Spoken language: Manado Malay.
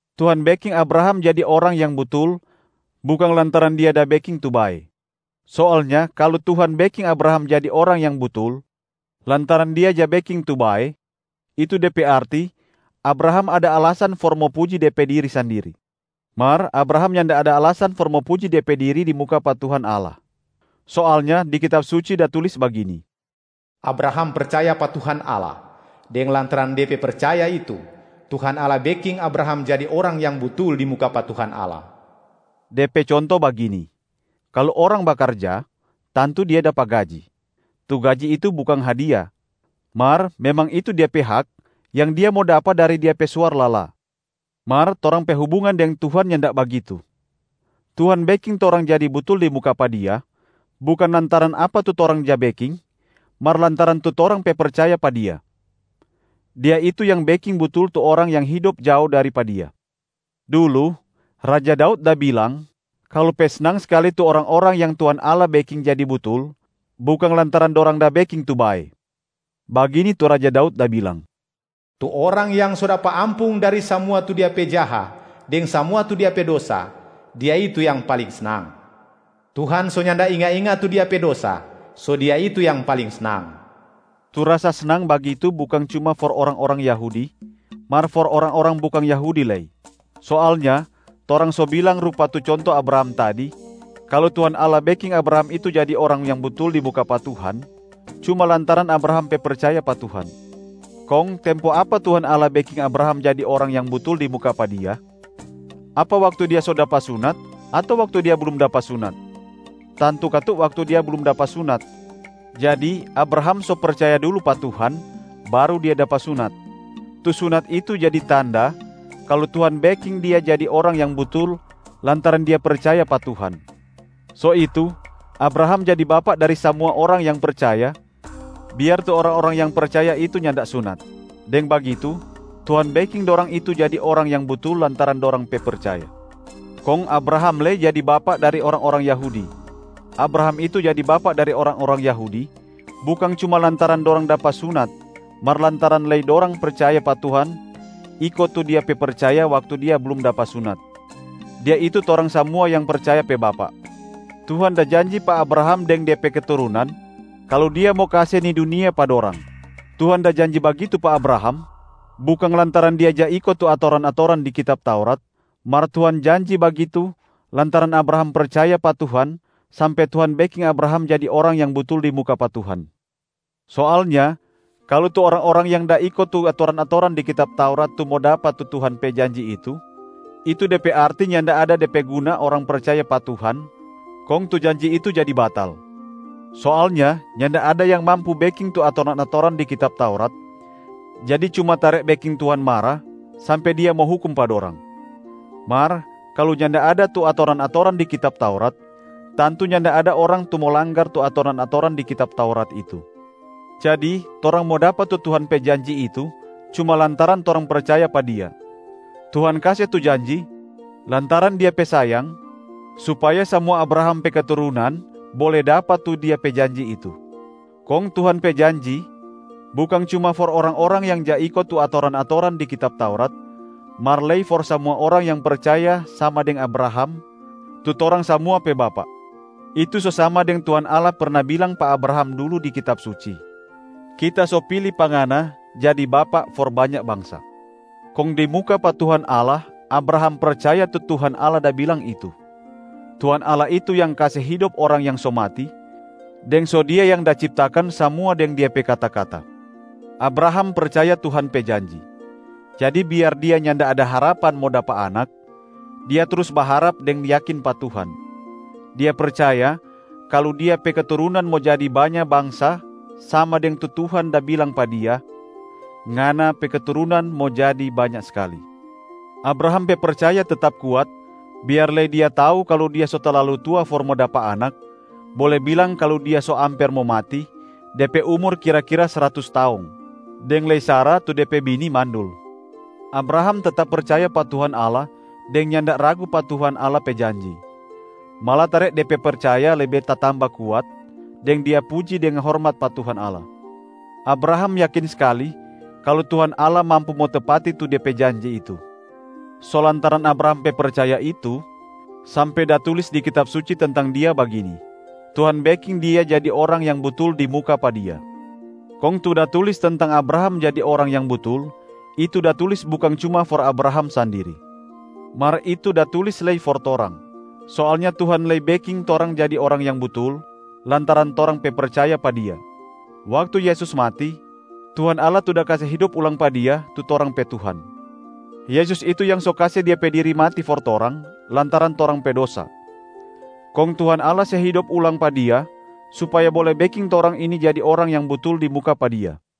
Tuhan beking Abraham jadi orang yang butul bukang lantaran dia da beking tu bae. Soalnya kalu Tuhan beking Abraham jadi orang yang butul lantaran dia ja beking tu bae, itu de pe arti Abraham ada alasan for mo puji de pe diri sandiri. Mar Abraham nyanda ada alasan for mo puji de pe diri di muka pa Tuhan Allah. Soalnya di Kitab Suci da tulis bagini, “Abraham percaya pa Tuhan Allah, deng lantaran de pe percaya itu, Tuhan Allah beking Abraham jadi orang yang butul di muka pa Tuhan Allah.” De pe conto bagini: kalu orang bakarja, tantu dia dapa gaji. Tu gaji itu bukang hadia, mar memang itu dia pe hak yang dia mo dapa dari dia pe suar lala. Mar torang pe hubungan deng Tuhan nyanda bagitu. Tuhan beking torang jadi butul di muka pa Dia bukang lantaran apa tu torang ja beking, mar lantaran tu torang pe percaya pa Dia. Dia itu yang beking butul tu orang yang hidop jao dari pa Dia. Dulu, raja Daud da bilang kalu pe snang skali tu orang-orang yang Tuhan Allah beking jadi butul bukang lantaran dorang da beking tu bae. Bagini tu Raja Daud da bilang, “Tu orang yang so dapa ampung dari samua tu dia pe jaha deng samua tu dia pe dosa, dia itu yang paling snang. Tuhan so nyanda inga-inga tu dia pe dosa, so dia itu yang paling snang.” Tu rasa snang bagitu bukang cuma for orang-orang Yahudi, mar for orang-orang bukang Yahudi lei. Soalnya torang so bilang rupa tu conto Abraham tadi, kalu Tuhan Allah beking Abraham itu jadi orang yang butul di muka pa Tuhan cuma lantaran Abraham pe percaya pa Tuhan. Kong tempo apa Tuhan Allah beking Abraham jadi orang yang butul di muka pa Dia? Apa waktu dia so dapa sunat ato waktu dia blum dapa sunat? Tantu katu waktu dia blum dapa sunat. Jadi Abraham so percaya dulu pa Tuhan, baru dia dapa sunat. Tu sunat itu jadi tanda kalu Tuhan beking dia jadi orang yang butul lantaran dia pe percaya pa Tuhan. So itu, Abraham jadi bapak dari samua orang yang percaya, biar tu orang-orang yang percaya itu nyanda sunat. Deng bagitu, Tuhan beking dorang itu jadi orang yang butul lantaran dorang pe percaya. Kong Abraham lei jadi bapak dari orang-orang Yahudi. Abraham itu jadi bapak dari orang-orang Yahudi bukang cuma lantaran dorang dapa sunat mar lantaran lei dorang percaya pa Tuhan iko tu dia pe percaya waktu dia blum dapa sunat. Dia itu torang samua yang percaya pe bapak. Tuhan da janji pa Abraham deng de pe keturunan kalu Dia mo kase ni dunia pa dorang. Tuhan da janji bagitu pa Abraham bukang lantaran dia ja iko tu atoran-atoran di kitab Taurat, mar Tuhan janji bagitu lantaran Abraham percaya pa Tuhan sampe Tuhan beking Abraham jadi orang yang butul di muka pa Tuhan. Soalnya kalu tu orang-orang yang da iko tu atoran-atoran di kitab Taurat tu mo dapa tu Tuhan pe janji itu, itu de pe arti nyanda ada de pe guna orang percaya pa Tuhan, kong tu janji itu jadi batal. Soalnya nyanda ada yang mampu beking tu atoran-atoran di kitab Taurat, jadi cuma tare beking Tuhan mara sampe Dia mo hukum pa dorang. Mar kalu nyanda ada tu atoran-atoran di kitab Taurat, tantu nyanda ada orang tu mo langgar tu atoran-atoran di kitab Taurat itu. Jadi torang mo dapa tu Tuhan pe janji itu cuma lantaran torang percaya pa Dia. Tuhan kase tu janji lantaran Dia pe sayang supaya samua Abraham pe keturunan bole dapa tu Dia pe janji itu. Kong Tuhan pe janji bukang cuma for orang-orang yang ja iko tu atoran-atoran di kitab Taurat, mar lei for samua orang yang percaya sama deng Abraham, tu torang samua pe bapak. Itu so sama deng Tuhan Allah perna bilang pa Abraham dulu di Kitab Suci, “Kita so pili pa ngana jadi bapak for banya bangsa.” Kong di muka pa Tuhan Allah Abraham percaya tu Tuhan Allah da bilang itu. Tuhan Allah itu yang kase hidop orang yang so mati, deng so Dia yang da ciptakan samua deng Dia pe kata-kata. Abraham percaya Tuhan pe janji. Jadi biar dia nyanda ada harapan mo dapa anak, dia trus baharap deng yakin pa Tuhan. Dia percaya kalu dia pe keturunan mo jadi banya bangsa sama deng tu Tuhan da bilang pa dia, “Ngana pe keturunan mo jadi banya skali.” Abraham pe percaya tetap kuat biar lei dia tau kalu dia so talalu tua for mo dapa anak, bole bilang kalu dia so amper mo mati, de pe umur kira-kira sratus taong. Deng lei Sara tu de pe bini mandul. Abraham tetap percaya pa Tuhan Allah deng nyanda ragu pa Tuhan Allah pe janji. Malatare de pe percaya lebe tatamba kuat, deng dia puji deng hormat pa Tuhan Allah. Abraham yakin skali kalu Tuhan Allah mampu mo tepati tu De pe janji itu. So lantaran Abraham pe percaya itu, sampe da tulis di Kitab Suci tentang dia bagini, “Tuhan beking dia jadi orang yang butul di muka pa Dia.” Kong tu da tulis tentang Abraham jadi orang yang butul, itu da tulis bukang cuma for Abraham sandiri. Mar itu da tulis lei for torang. Soalnya Tuhan lei beking torang jadi orang yang butul lantaran torang pe percaya pa Dia. Waktu Yesus mati, Tuhan Allah tu da kase hidop ulang pa Dia tu torang pe Tuhan. Yesus itu yang so kase Dia pe diri mati for torang lantaran torang pe dosa. Kong Tuhan Allah se hidop ulang pa Dia supaya bole beking torang ini jadi orang yang butul di muka pa Dia.